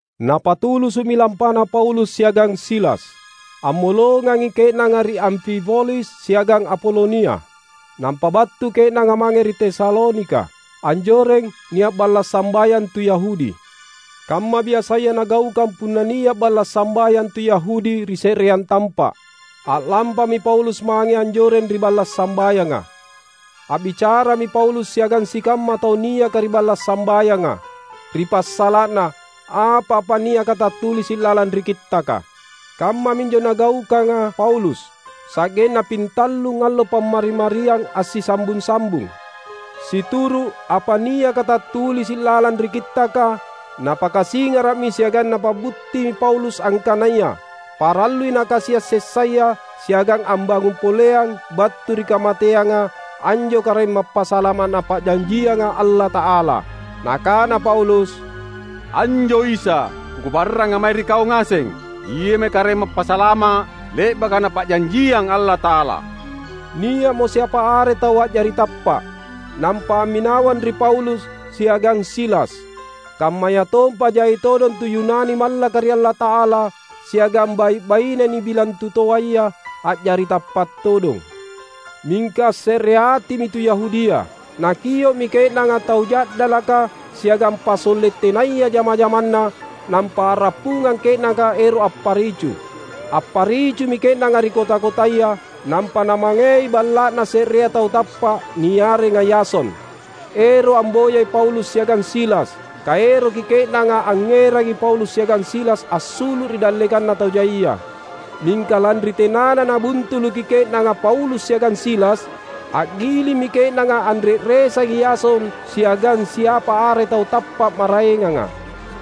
Napatulusu’mi lampana Paulus siagang Silas. Ammolongangi ke’nanga ri Amfipolis siagang Apolonia, nampa battu ke’nanga mange ri Tesalonika. Anjoreng nia’ balla’ sambayang tu Yahudi. Kamma biasaya nagaukang punna nia’ balla’ sambayang tu Yahudi ri se’reang tampa’, a’lampami Paulus mange anjoreng ri balla’ sambayanga. A’bicarami Paulus siagang sikamma tau niaka ri balla’ sambayanga, ri passala’na apa-apa niaka tattulisi’ lalang ri Kittaka. Kammaminjo nagaukanga Paulus sa’genna pintallung allo Pammari-mariang assisambung-sambung. Situru’ apa niaka tattulisi’ lalang ri Kittaka, napakasingara’mi siagang napa’buttimi Paulus angkanaya parallui Nakasia’ sessaya siagang ambangung poleang battu ri kamateanga anjo Karaeng Mappasalama’ Napa’janjianga Allata’ala. Nakana Paulus, "Anjo Isa, kukabarranga mae ri kau ngaseng, Iami Karaeng Mappasalama’ le’baka Napa’janjiang Allata’ala." Nia’mo siapa are tau a’jari tappa’, nampa amminawang ri Paulus siagang Silas; kammayatompa jai todong tu Yunani mallaka ri Allata’ala, siagang bai’-baine nibilang tutoaya, a’jari tappa’ todong. Mingka assereatimi tu Yahudia. Nakio’mi ke’nanga tau ja’dalaka siagang pasolle’ tenaya jama-jamanna, nampa a’rappungang ke’nanga ero’ apparicu. Apparicumi ke’nanga ri kota-kotaya; nampa namangei balla’na se’rea tau tappa’ niarenga Yason, ero’ amboyai Paulus siagang Silas, kaeroki ke’nanga angngerangi Paulus siagang Silas assulu’, ri dallekanna tau jaia. Mingka lanri tenana nabuntuluki ke’nanga Paulus siagang Silas, a’gilimmi ke’nanga anre’resangi Yason siagang siapa are tau tappa’ maraenganga,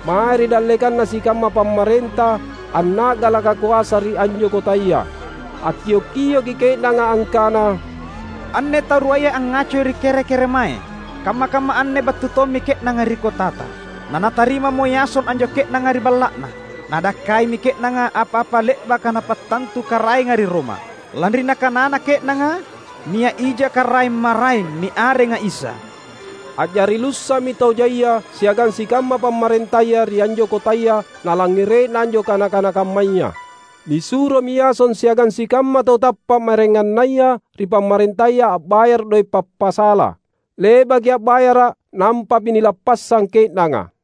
mae ri dallekanna sikamma pamarenta anna’galaka koasa ri anjo kotaya. Akkio’-kioki ke’nanga angkana, "Anne tau ruaya angngacoi ri kere-keremae! Kamma-kamma anne battu tommi ke’nanga ri kotata; na natarimamo Yason anjo ke’nanga ri balla’na. Nadakkaimi ke’nanga apa-apa le’baka napattantu Karaenga ri Roma, lanri nakanana ke’nanga nia’ ija karaeng maraeng niarenga Isa." A’jari lussa’mi tau jaia siagang sikamma pamarentaya ri anjo kotaya nalangngere’na anjo kana-kana kammaya. Nisuromi Yason siagang sikamma tau tappa’ maraengannaya ri pamarentaya a’bayara’ doe’ pappassala. Le’baki a’bayara’ nampami nilappassang ke’nanga.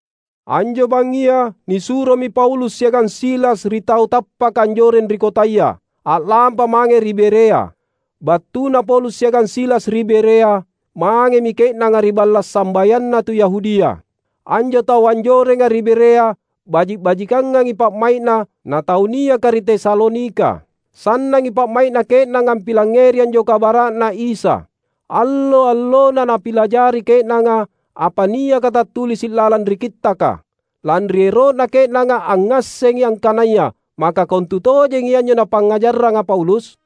Anjo bangngia nisuromi Paulus siagang Silas ri tau tappaka anjoreng ri kotaya, a’lampa mange ri Berea. Battuna Paulus siagang Silas ri Berea, mangemi ke’nanga ri balla’ sambayanna tu Yahudia. Anjo tau anjorenga ri Berea baji’-bajikangangi pa’mai’na na tau niaka ri Tesalonika. Sannangi pa’mai’na ke’nanga ampilangngeri anjo kabara’Na Isa; allo-allona napilajari ke’nanga apa niaka tattulisi’ lalang ri Kittaka, lanri ero’na ke’nanga angngassengi angkanaya maka kontutojengi anjo napangngajarranga Paulus.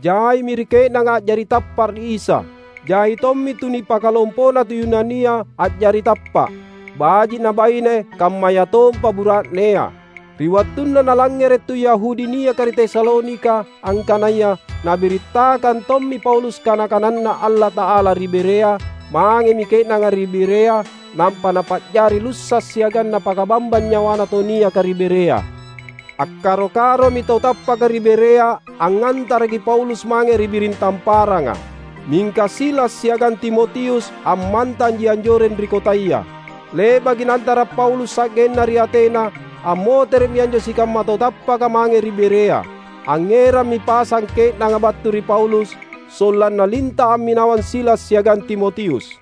Jaimi ri ke’nanga a’jari tappa’ ri Isa. Jai tommi tu nipakalompona tu Yunania a’jari tappa’, baji’ nabaine kammayatompa bura’nea. Ri wattunna nalangngere’ tu Yahudi niaka ri Tesalonika angkanaya nabirittakang tommi Paulus kana-kananNa Allata’ala ri Berea, mangemi ke’nanga ri Berea; nampa napa’jari lussa’ siagang napakabambang nyawana tau niaka ri Berea. Akkaro-karomi tau tappaka ri Berea angngantaraki Paulus mange ri biring tamparanga. Mingka Silas siagang Timotius ammantanji anjoreng ri kotaya. Le’baki naantara’ Paulus sa’genna ri Atena, ammotere’mi anjo sikamma tau tappaka mange ri Berea. Angngerammi pasang ke’nanga battu ri Paulus, sollanna linta’ amminawang Silas siagang Timotius.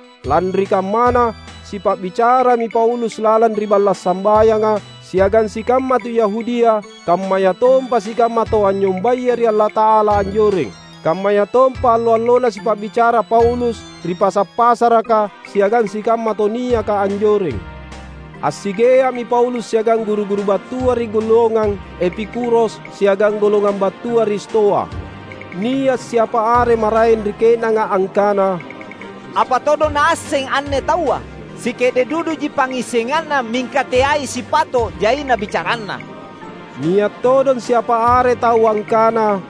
Lanri kammana sipa’bicarami Paulus lalang ri balla’ sambayanga siagang sikamma tu Yahudia kammayatompa sikamma tau anynyombaya ri Allata’ala anjoreng. Kammayatompa allo-allona sipa’bicara Paulus ri pasa’-pasaraka siagang sikamma tau niaka anjoreng. Assigea’mi Paulus siagang guru-guru battua ri golongang Epikuros siagang golongang battua ri Stoa. Nia’ siapa are maraeng ri ke’nanga angkana, "Apa todong naasseng anne taua? Sike’de’ duduji pangngissenganna mingka teai sipato’ jaina bicaranna!" Nia’ todong siapa are tau angkana,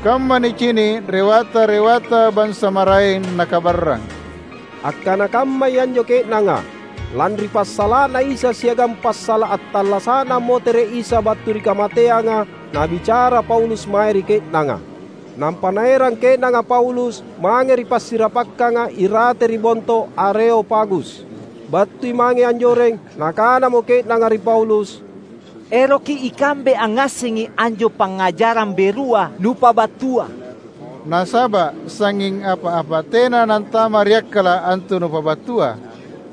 "Kamma nicini’ rewata-rewata bansa maraeng nakabarrang." Akkana kammai anjo ke’nanga, lanri passala’Na Isa siagang passala’ attallasa’Na ammotere’ Isa battu ri kamateanga nabicara Paulus mae ri ke’nanga. Nampa naerang ke’nanga Paulus mange ri passirapakkanga irate ri Bonto Areopagus. Battui mange anjoreng, nakanamo ke’nanga ri Paulus, "Eroki ikambe angngassengi anjo pangngajarang berua nupabattua. Nasaba’ sangnging apa-apa tena nantama’ ri akkala’ antu nupabattua.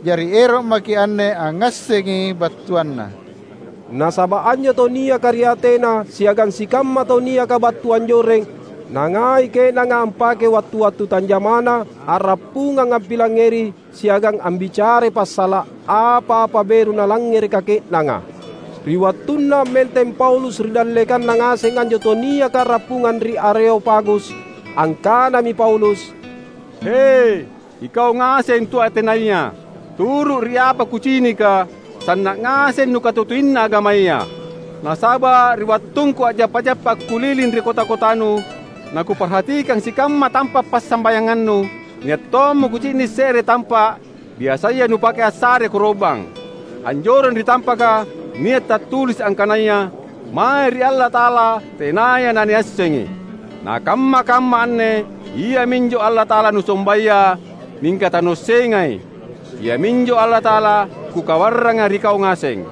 Jari ero’ maki’ anne angngassengi battuanna." (Nasaba’ anjo tau niaka ri Atena siagang sikamma tauniaka battu anjoreng, nangai ke’nanga ampakei wattu-wattu tanjamana a’rappungang ampilangngeri siagang ambicarai passala’ apa-apa beru nalangngereka ke’nanga.) Ri wattunna ammenteng Paulus ri dallekanna ngaseng anjo tau niaka a’rappungang ri Areopagus, angkanami Paulus, "He, ikau ngaseng tu Atenaya! Turu’ ri apa kucinika, sanna’ ngaseng nukatutuina agamaya. Nasaba’ ri wattungku a’jappa-jappa akkuliling ri kota-kotanu, nakuparhatikang sikamma tampa’ passambayangannu, nia’ tommo kucini’ se’re tampa’ biasaya nupake assare koro’bang. Anjoreng ri tampaka nia’ tattulisi’ angkanaya, ‘Mae ri Allata’ala Tenaya Naniassengi.’ Na kamma-kamma anne, iaminjo Allata’ala nusombaya mingka tanuassengai, Iaminjo Allata’ala kukabarranga ri kau ngaseng.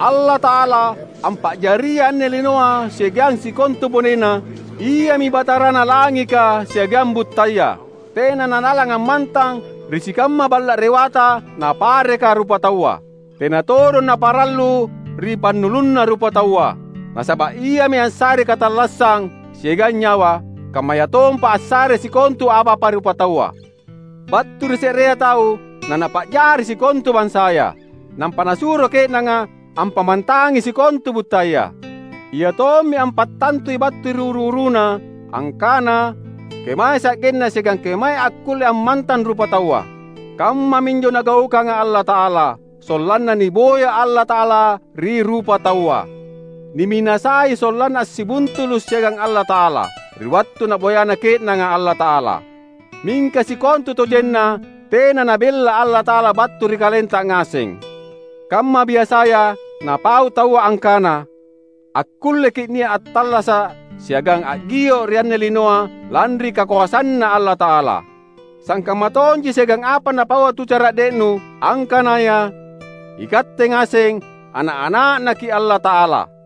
Allata’ala ampa’jariai anne linoa siagang sikontu bonena, Iami Batarana langika siagang buttaya. Tena nalalang ammantang ri sikamma balla’ rewata napareka rupataua. Tena todong Naparallu ri pannulunna rupataua, nasaba’ Iami assarei katallassang siagang nyawa, kammayatompa assarei sikontu apa-apa rupataua! Battu ri se’rea tau Nanapa’jari sikontu bansaya, nampa Nasuro ke’nanga ampammantangi sikontu buttaya. Iatommi ampattantui battu ri uru-uruna angkana kemae sa’genna siagang kemaei akkulle ammantang rupataua. Kammaminjo Nagaukanga Allata’ala, sollanna niboya Allata’ala ri rupataua. Niminasai sollanna assibuntulu’ siagang Allata’ala, ri wattu naboyana ke’nanga Allata’ala. Mingka sikontutojenna tena nabella Allata’ala battu ri kalenta ngaseng. Kamma biasaya napau taua angkana, ‘Akkulleki’ nia’, attallasa’, siagang a’gio’ ri anne linoa lanri kakoasanNa Allata’ala.’ Sangkamma tonji siagang apa napaua tu cara’de’nu, angkanaya, ‘Ikatte ngaseng, ana’-ana’Naki’ Allata’ala.’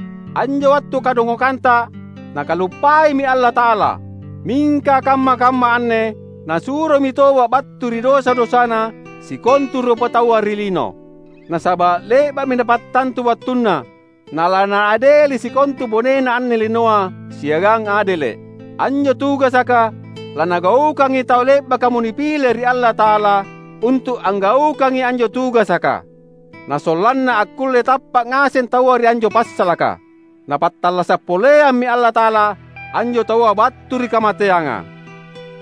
Anjo wattu kadongokanta Nakaluppaimi Allata’ala, mingka kamma-kamma anne Nasuromi toba’ battu ri dosa-dosana sikontu rupataua ri lino. Nasaba’ le’ba’mi Napattantu wattunna nalaNaadeli sikontu bonena anne linoa siagang adele’. Anjo tugasaka lanagaukangi tau le’bakamo nipile ri Allata’ala untu’ anggaukangi anjo tugasaka. Na sollanna akkulle tappa’ ngaseng taua ri anjo passalaka, Napattallasa’ poleammi Allata’ala anjo taua battu ri kamateanga!"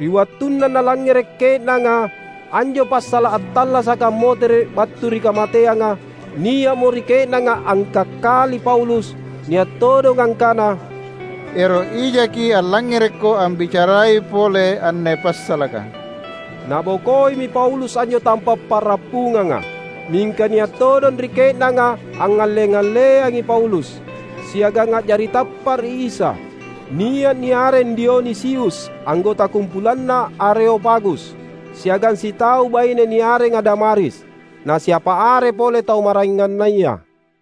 Ri wattunna nalangngere’ ke’nanga anjo passala’ attallasaka ammotere’ battu ri kamateanga, nia’mo ri ke’nanga angkakkali Paulus. Nia’ todong angkana, "Ero’ ijaki’ allangngerekko ambicarai pole anne passalaka!" Nabokoimi Paulus anjo tampa’ pa’rappunganga. Mingka nia’ todong ri ke’nanga angngalle-alleangi Paulus, siagang a’jari tappa’ ri Isa: nia’ niareng Dionisius anggota kumpulanna Areopagus, siagang sitau baine niarenga Damaris, na siapa are pole tau maraengannaya.